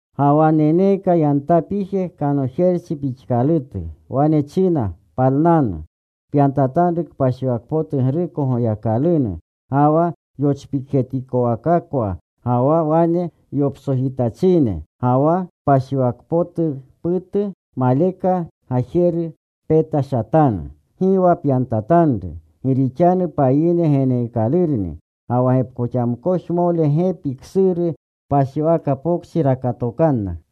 Ga wa neneeka yantapije kanojerchi pixkalutu. Wane china, “Palnanu. Pyantatanru kpashiwakpotugruko Goyakalunu, ga wa yochpikjetikowakakwa ga wa wane yoptsojityachine. Ga wa kpashiwakpotuputu maleka gajeru petashatanu. Gi wa pyantatanru. Gi rixanu payine geneekalurni. Ga wa gepkoxamkojmole gepi ksuru kpashiwaka pokchi rakatokanna.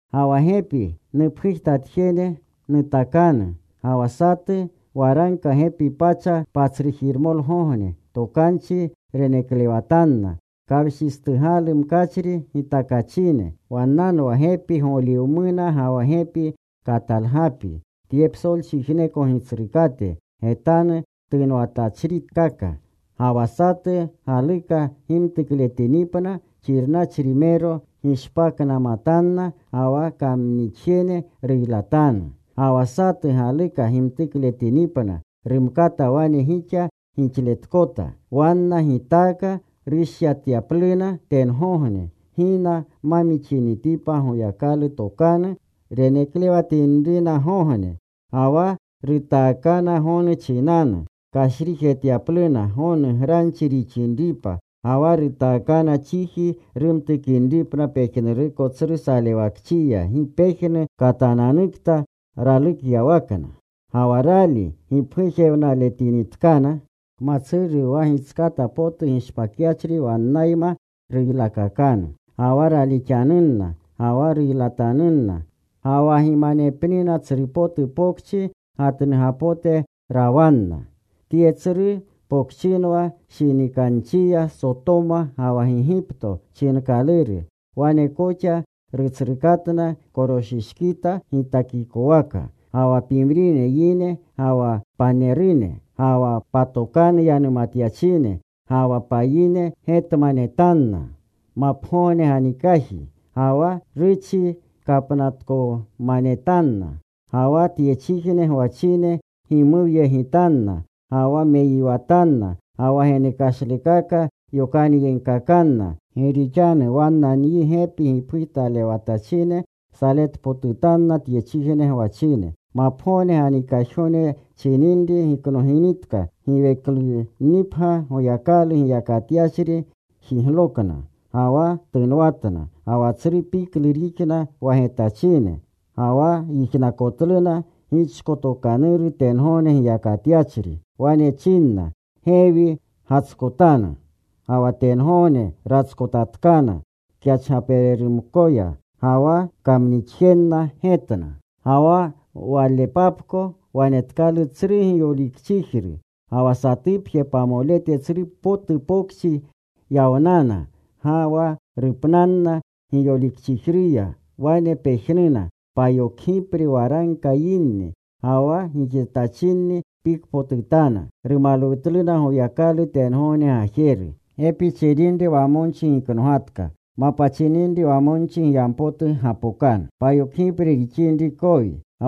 “Ga wa gepi nupgujtatjene nutakanu. Ga wa satu waragka gepi pacha patsrujiremolgogne tokanchi reneklewatanna, kawshistugalu mkachri gitakachine.” Wannanwa gepi goliwamuna ga wa gepi katalgapi, tye psolchijneko Gitsrukate getanu tunwatachrikaka. Ga wa satu galuka gimtukletinipna, xirnachrimero gishpaknamatanna ga wa kamnixjene ruylatanu. Ga wa satu galuka gimtukletinipna, rumkata wane gixa giylaletkota. Wanna gitaaka rushyatyapluna tengogne, gina ma mixinitipa Goyakalu tokanu reneklewatinrinagogne. Ga wa rutaakana gonu chinanu, kashrijetyapluna gonu granchi rixinripa. Ga wa rutaakana chiji rumtukinripna pejnuruko tsru salewakchiya gi pejnu katananukta ralukyawakna. Ga wa rali gipgujtalewletinitkana, kmatsuru wa gitskata potu gishpakyachri wannayma ruylakakanu. Ga wa raalixanunna, ga wa ruylatanunna. Ga wa gimanepnina tsru potu pokchi gatnugapote rawanna. Tye tsru pokchinwa shinikanchiya Sotoma ga wa Gigipto chinkaluru. Wane koxa Rutsrukatna koroshishkita gitakikowaka. Ga wa pimrine yine, ga wa panerune, ga wa patokanu yanumatyachine, ga wa payine getmanetanna mapgogne ganikaji. Gi wa ruchi kapnatkomanetanna. Ga wa tyechijne gwachine gimuwyegitanna, ga wa meyiwatanna, ga wa genekashlukaka yokanyegkakanna. Gi rixanu wanna nyi gepi gipgujtalewatachine saletpotutanna tyechijne gwachine. Mapgogne ganikajgogne chininri giknoginitka, giweklunnipgya Goyakalu giyakatyachri jiglokna. Ga wa tunwatna. Ga wa tsru piklu rixna wa getachine. Ga wa yijnakotluna gichkotokanuru tengogne giyakatyachri. Wane chinna, “Gewi gatskotanu.” Ga wa tengogne ratskotatkana kyachgapererumkoya. Ga wa kamnixjenna getna. Ga wa walepapko wanetkalu tsru giyolikchijru. Ga wa satupje pamolete tsru potu pokchi yawnana. Ga wa rupnanna giyolikchijruya wane pejnuna: payokgipre waragka yinni. Ga wa gixetachinni pikpotutana. Rumalwutluna Goyakalu tengogne Gajeru. Gepi chininri wamonchi giknogatka. Mapa chininri wamonchi giyampotu gapokanu. Ga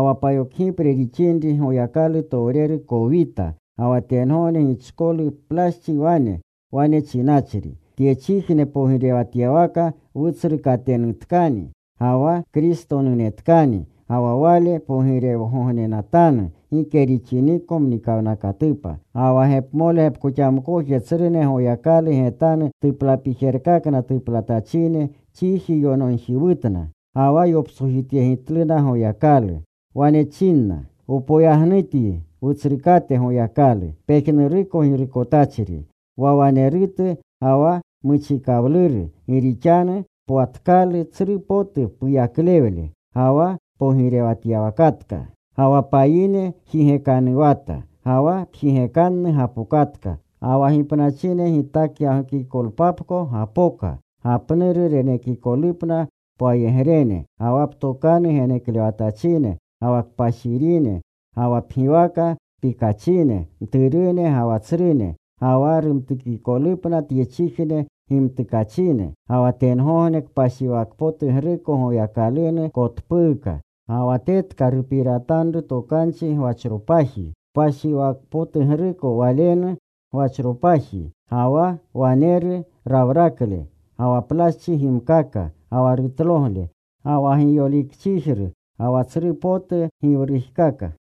wa payokgipre rixinri Goyakalutowreru kowita. Ga wa tengogne gichkolu plaschi wane, wane chinachri: Tyechijne pogirewatyawaka Wutsrukatenutkani ga wa Kristotenutkani. Ga wa Wale pogirewgognenatanu gike rixiniko mnikawnakatupa. Ga wa gepmole gepkoxamkoje tsrune Goyakalu getanu tuplapijerkakna tuplatachine chiji yonogjiwutna. Ga wa yoptsojityegitluna Goyakalu. Wane chinna: Wpoyagnutyi, Wutsrukate Goyakalu, pejnuruko Girukotachri, wa wanerutu ga wa muchikawluru, gi rixanu pwatkalu tsru potu puyaklewle ga wa pogirewatatka. Ga wa payine jigekanuwata. Ga wa pjigekanu gapokatka. Ga wa gipnachine gitakyagokikolpapko gapoka gapnuru renekikolupna pwayegrene ga wa ptokanu geneklewatachine ga wa kpashirine, ga wa pgiwaka pikachine, mturune ga wa tsrune. Ga wa rumtukikolupna tyechijne gimtukachine. Ga wa tengogne kpashiwakpotugruko Goyakalunu kotpuuka. Ga wa tetka rupiratanru tokanchi gwanropaji kpashiwakpotugruko Walenu gwachropaji. Ga wa waneru rawrakle, ga wa plaschi gimkaka, ga wa rutlogle, ga wa giyolikchijru, ga wa tsru potu giwrujkaka.